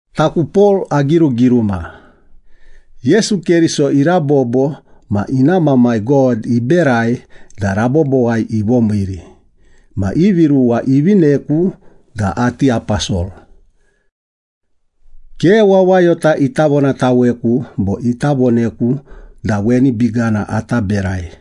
Taku Pol agirugiruma. Yesu Keriso irabobo ma ina Mamai God iberai da rabobowai ivomiiri ma ivi ruwa ivineku da ati aposol. Ke wawayota ita vonataweku bo ita voneku da weni bigana ata berai.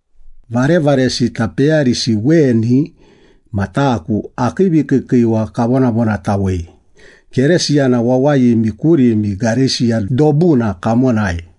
Varevaresita peyarisi weni ma taku akii vikiikiiwa kavonavonatawei Keresiyana wawayimi kurimi Gareisiya dobuna kamonai.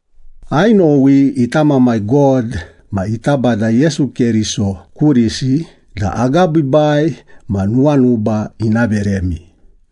Ainowi ita Mamai God ma ita Bada Yesu Keriso kurisi da agabiibai ma nuwanuba ina veremi.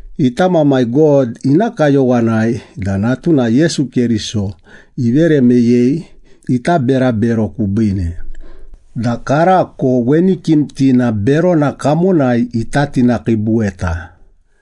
Ita Mamai God ina kayowanai da natuna Yesu Keriso ivere meyei ita berabero kubiine, da karako weni kimtina berona kamonai ita tinakiibutaweta.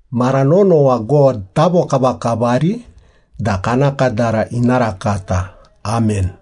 Mara nonowa God tavokavakavari da kana kadara ina rakata. Amen.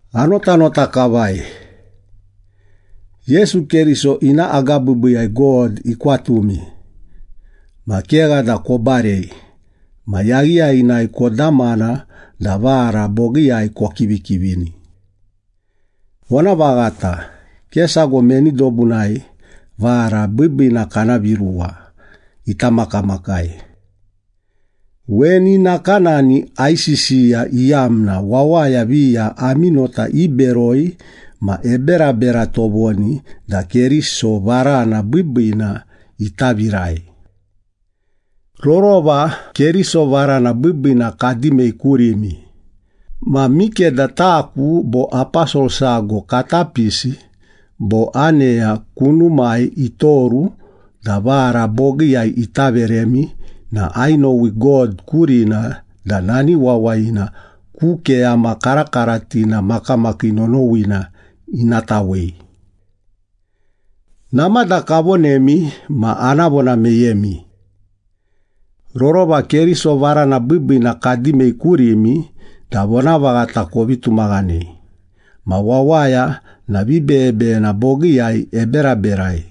Anotanota kavai! Yesu Keriso ina agabiibiiyai God ikwatumi. Ma kegha da kobarei ma yaghiyaghinai kodamana da vara bogiiyai kokivikivini. Vonavaghata, ke sago meni dobunai “vara biibiina kana viruwa” ita makamakai. Weni nakanani aisisiya iyamna wawaya viya ami nota iberoi ma eberabera tovoni da Keriso varana biibiina ita virai. Rorova Keriso varana biibiina kadimei kurimi, ma mikeda taku bo aposol sago kata pisi bo aneya kunumai itoru da vara bogiiyai ita veremi na ainowi God kurina da nani wawayina ku keyama karakaratina makamakii nonowina ina tawei. Namada kavonemi ma ana vona meyemi. Rorova Keriso varana biibiina kadimei kurimi da vonavaghata kovi tumaghanei, ma wawaya na vibeyebeyena bogiiyai eberaberai,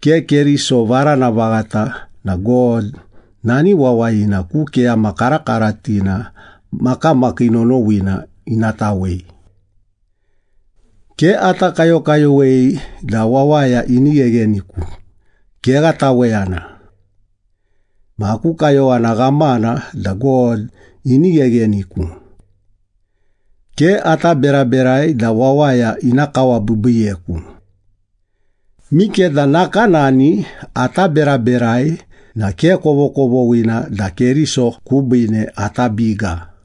ke Keriso varana vaghata na God nani wawayina ku keyama karakaratina makamakii nonowina ina tawei! Ke ata kayokayowei da wawaya ini ghegheniku, kegha taweyana! Ma aku kayowana ghamana da God ini ghegheniku. Ke ata beraberai da wawaya ina kawabiibiiyeku. Mikeda nakanani ata beraberai na ke kovokovoghina da Keriso kubiine ata biga.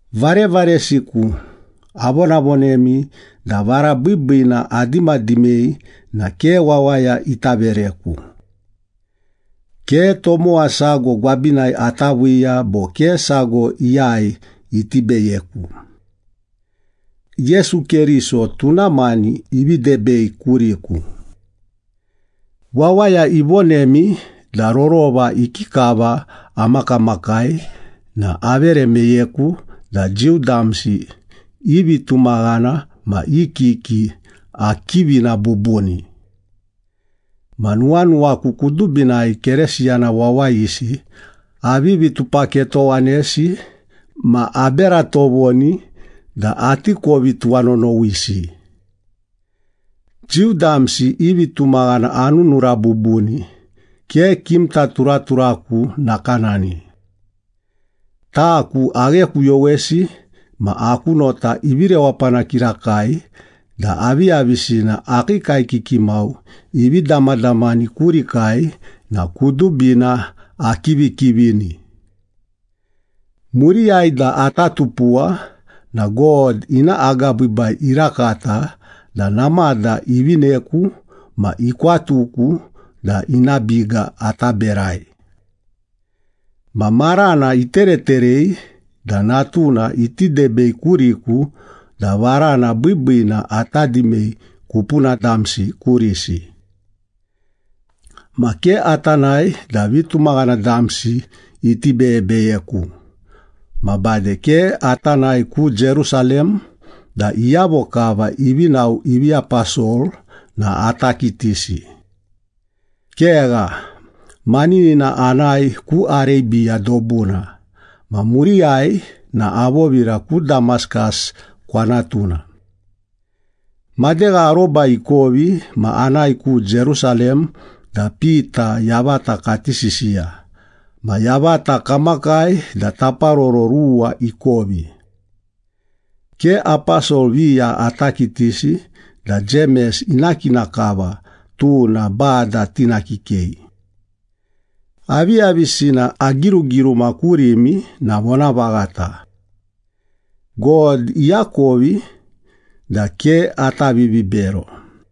Varevaresiku, avonavonemi da vara biibiina adimadimei na ke wawaya ita vereku. Ke tomowa sago gwabinai ata viiya bo ke sago iyai iti beyeku. Yesu Keriso tuna mani ivi debei kuriku. Wawaya ivonemi da rorova ikikava amakamakai na avere meyeku da Jiu damsi i vitumaghana ma i kiki akivina bubuni. Ma nuwanuwaku kudubinai Keresiyana wawayisi avivi tupaketowanesi ma abera tovoni da ati kovi tuwanonowisi. Jiu damsi i vitumaghana anunura bubuni, ke kimta turaturaku nakanani. Taku aghekuyowesi ma aku nota ivi rewapana kirakai da aviyavisina akii kaekiki mau ivi damadamani kurikai na kudubina akivikivini. Muriyai da ata tupuwa na God ina agabiibai irakata da namada ivineku ma ikwatuku da ina biga ata berai. Ma marana itereterei da Natuna iti debei kuriku da varana biibiina ata dimei kupuna damsi kurisi. Ma ke ata nae da vitumaghana damsi iti beyebeyeku, ma bade ke ata nae ku Jerusalem da iyavo kava ivi nao ivi aposol na ata kitisi. Kegha, maninina anae ku Arebiya dobuna, ma muriyai na avovira ku Damaskas kwanatuna. Madegha aroba ikovi ma anae ku Jerusalem da Pita yavata kati sisiya, ma yavata kamakai da taparoro ruwa ikovi. Ke aposol viya ata kitisi da Jemes ina kina kava, tuna Bada tina kikei. Aviyavisina agirugiruma kurimi na vonavaghata. God iakovi da ke ata vivibero.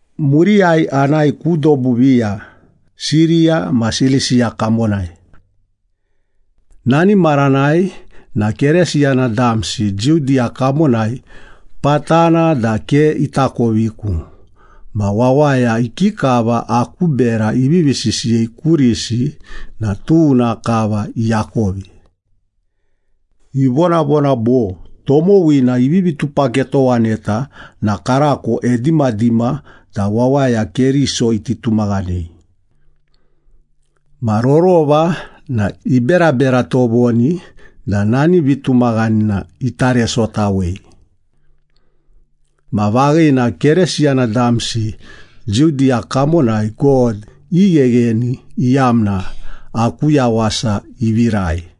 Muriyai anae ku dobu viya, Siriya ma Silisiya kamonai. Nani maranai na Keresiyana damsi Judiya kamonai patana da ke itakoviku ma wawaya ikikava aku bera ivivi sisiyei kurisi na tuna kava iakovi. Ivonavona bo, “Tomowina ivivi tupaketowaneta na karako edimadima da wawaya Keriso iti tumaghanei. Ma rorova na iberabera tovoni da nani vitumaghanina ita resotawei.” Ma vaghina Keresiyana damsi Judiya kamonai God ighegheni iyamna aku yawasa ivirai.